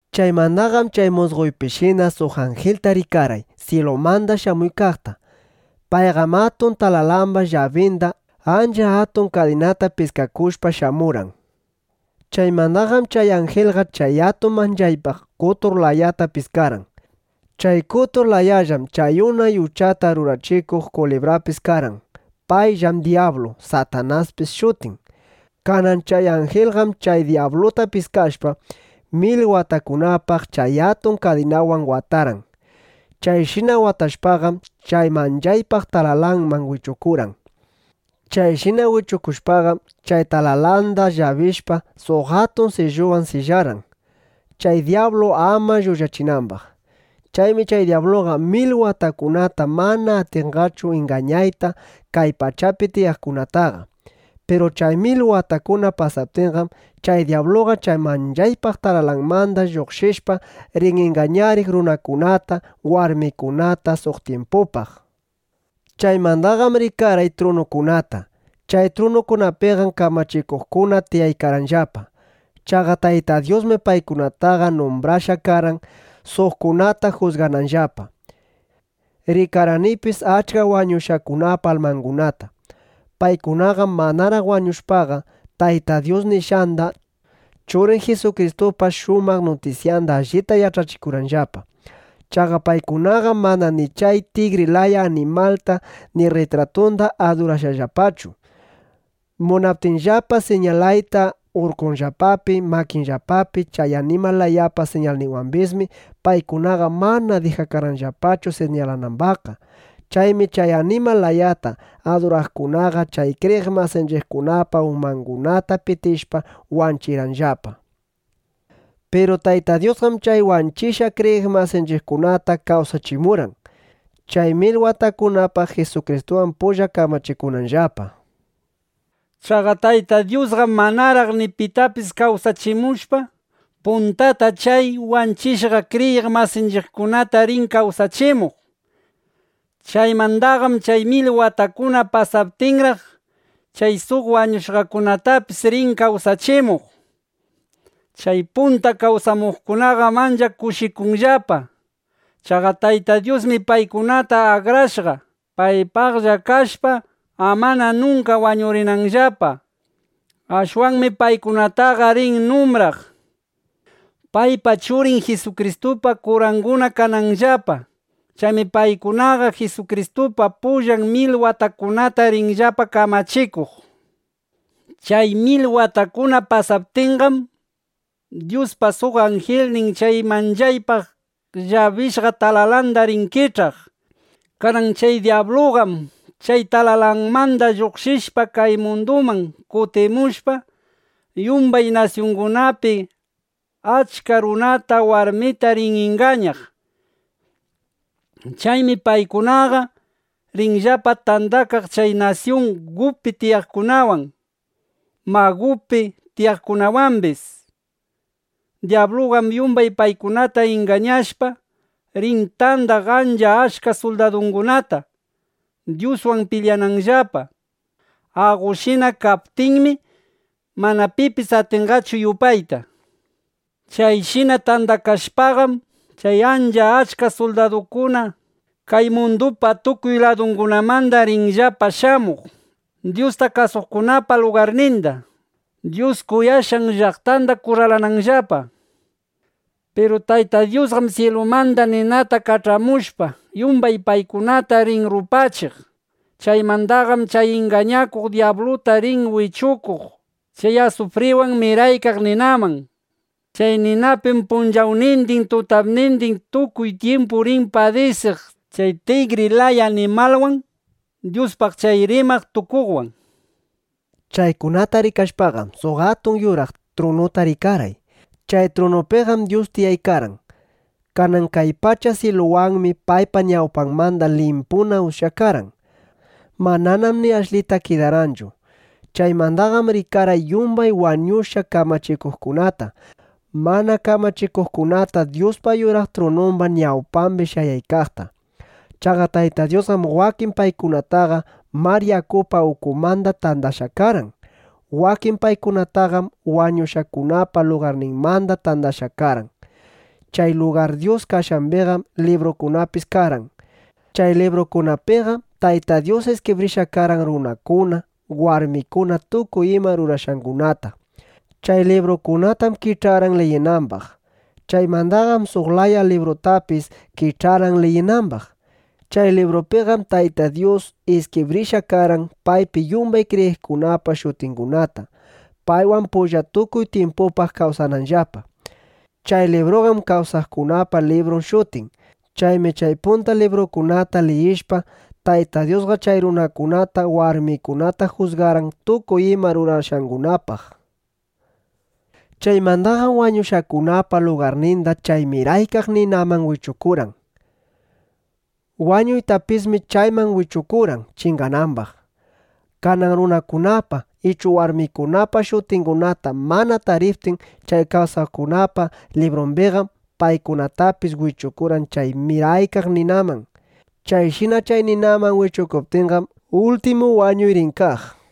Chaymandaqam chay musqoypishina suq anjilta rikarqay, syilumanda shamuykaqta. Payqam atun talalamba llabinda, ancha atun kadinata piskakushpa shamurqan. Chaymandaqam chay anjilqa chay atun manchaypaq qotur layata piskarqan. Chay qotur layallam chay unay uchata rurachikuq kulibrapis karqan. Payllam dyablu, Satanaspis shutin. Kanan chay anjilqam chay dyabluta piskashpa, mil watakunapaq chay atun kadinawan watarqan. Chayshina watashpaqam, chay manchaypaq talalanman wichukurqan. Chayshina wichukushpaqam, chay talalanda llabishpa, suq atun silluwan sillarqan, chay dyablu ama lluqshinambaq. Chaymi chay dyabluqa mil watakunata mana atinqachu ingañayta kay pachapi tiyaqkunataqa. Piru chay mil watakuna pasaptinqam, chay dyabluqa chay manchaypaq talalanmanda lluqshishpa, rin ingañariq runakunata, warmikunata suq tyimpitupaq. Chaymandaqam rikarqay trunukunata. Chay trunukunapiqam kamachikuqkuna tiyaykarqanllapa. Chaqa Tayta Dyusmi paykunataqa numbrashqa karqan, suqkunata jusgananllapa. Rikarqanipis achka wañushqakunapa almangunata. Paykunaqam manaraq wañushpaqa, Tayta Dyus nishqanda, Churin Jisukristupa shumaq nutisyanda allita yach'achikurqanllapa. Chaqa paykunaqam mana ni chay tigri laya animalta ni rritratunda adurarqanllapachu. Munaptinllapa siñalayta urkunllapapi makinllapapi chay animal layapa siñalninwambismi, paykunaqa mana dijakarqanllapachu siñalanambaqqa. Chaymi chay animal layata aduraqkunaqa chay kriyiq masinchiqkunapa umangunata pitishpa, wanchirqanllapa. Piru Tayta Dyusqam chay wanchishqa kriyiq masinchiqkunata kawsachimurqan, chay mil watakunapaq Jisukristuwan pulla kamachikunanllapa. Chaqa Tayta Dyusqam manaraq ni pita kawsachimushpa, puntata chay wanchishqa kriyiq masinchiqkunata rin kawsachimuq. Chaymandaqam chay mil watakuna pasaptinraq, chay suq wañushqakunatapis rin kawsachimuq. Chay punta kawsamuqkunaqam ancha kushikunqallapa. Chaqa Tayta Dyusmi paykunataqa akrashqa, paypaqlla kashpa, amana nunka wañurinanllapa. Ashwanmi paykunataqa rin numbraq, paypa, Churin Jisukristupa kuranguna kanambaqllapa. Chaymi paykunaqa Jisukristupa pullan mil watakunata rinllapa kamachikuq. Chay mil watakuna pasaptinqam, Dyuspa suq anjilnin chay manchaypaq llabishqa talalanda rin kich'aq. Kanan chay dyabluqam chay talalanmanda lluqshishpa, kay munduman kutimushpa, yumbay nasyungunapi achka runata, warmita rin ingañaq. Chaymi paykunaqa rinllapa tandakaq chay nasyun Gugpi tiyaqkunawan, Magugpi tiyaqkunawambis. Dyabluqam yumbay paykunata ingañashpa, rin tandaq ancha achka suldadukunata, Dyuswan pilyananllapa. Aqoshina kaptinmi, mana pipis atinqachu yupayta. Chayshina tandakashpaqam, chay ancha achka suldadukuna kay mundupa tukuy ladungunamanda rinllapa shamuq, Dyusta kasuqkunapa lugarninda, Dyus kuyashqan llaqtanda kurralananllapa. Piru Tayta Dyusqam syilumanda ninata kach'amushpa, yumbay paykunata rin rupachiq. Chaymandaqam chay ingañakuq dyabluta rin wichukuq chay asufriwan miraykaq ninaman. Chay ninapim punchawnindin tutapnindin tukuy tyimpu rin padisiq chay tigri laya animalwan, Dyuspaq chay rimaq tukuqwan. Chaykunata rikashpaqam, suq atun yuraq trunuta rikarqay. Chay trunupiqam Dyus tiyaykarqan. Kanan kay pacha syiluwanmi paypa ñawpanmanda limpuna ushyakarqan. Mananam ni ashlita kidarqanchu. Chaymandaqam rikarqay yumbay wañushqa kamachikuqkunata, mana kamachikuqkunata Dyuspa yuraq trunumba ñawpambi shayaykaqta. Chaqa Tayta Dyusqam wakin paykunataqa mar yakupa ukunmanda tandashqa karqan. Wakin paykunataqam wañushqakunapa lugarninmanda tandashqa karqan. Chay lugar Dyus kashqambiqam librukunapis karqan. (Chay librukunapiqam, Tayta Dyus iskibrishqa karqan runakuna, warmikuna tukuy ima rurashqangunata.) Chay librukunatam kich'arqan liyinambaq. Chaymandaqam suq laya librutapis kich'arqan liyinambaq. (Chay librupiqam Tayta Dyus iskibrishqa karqan paypi yumbay kriyiqkunapa shutingunata, paywan pulla tukuy tyimpupaq kawsananllapa.) Chay libruqam “Kawsaqkunapa Librun” shutin. Chaymi chay punta librukunata liyishpa, Tayta Dyusqa chay runakunata, warmikunata jusgarqan tukuy ima rurashqangunapaq. Chaymandaqam wañushqakunapa lugarninda chay miraykaq ninaman wichukurqan. Wañuytapismi chayman wichukurqan chinganambaq. Kanan runakunapa ichu warmikunapa shutingunata mana tariptin chay kawsaqkunapa librumbiqam, paykunatapis wichukurqan chay miraykaq ninaman. Chayshina chay ninaman wichukuptinqam, ultimu wañuy rin kaq.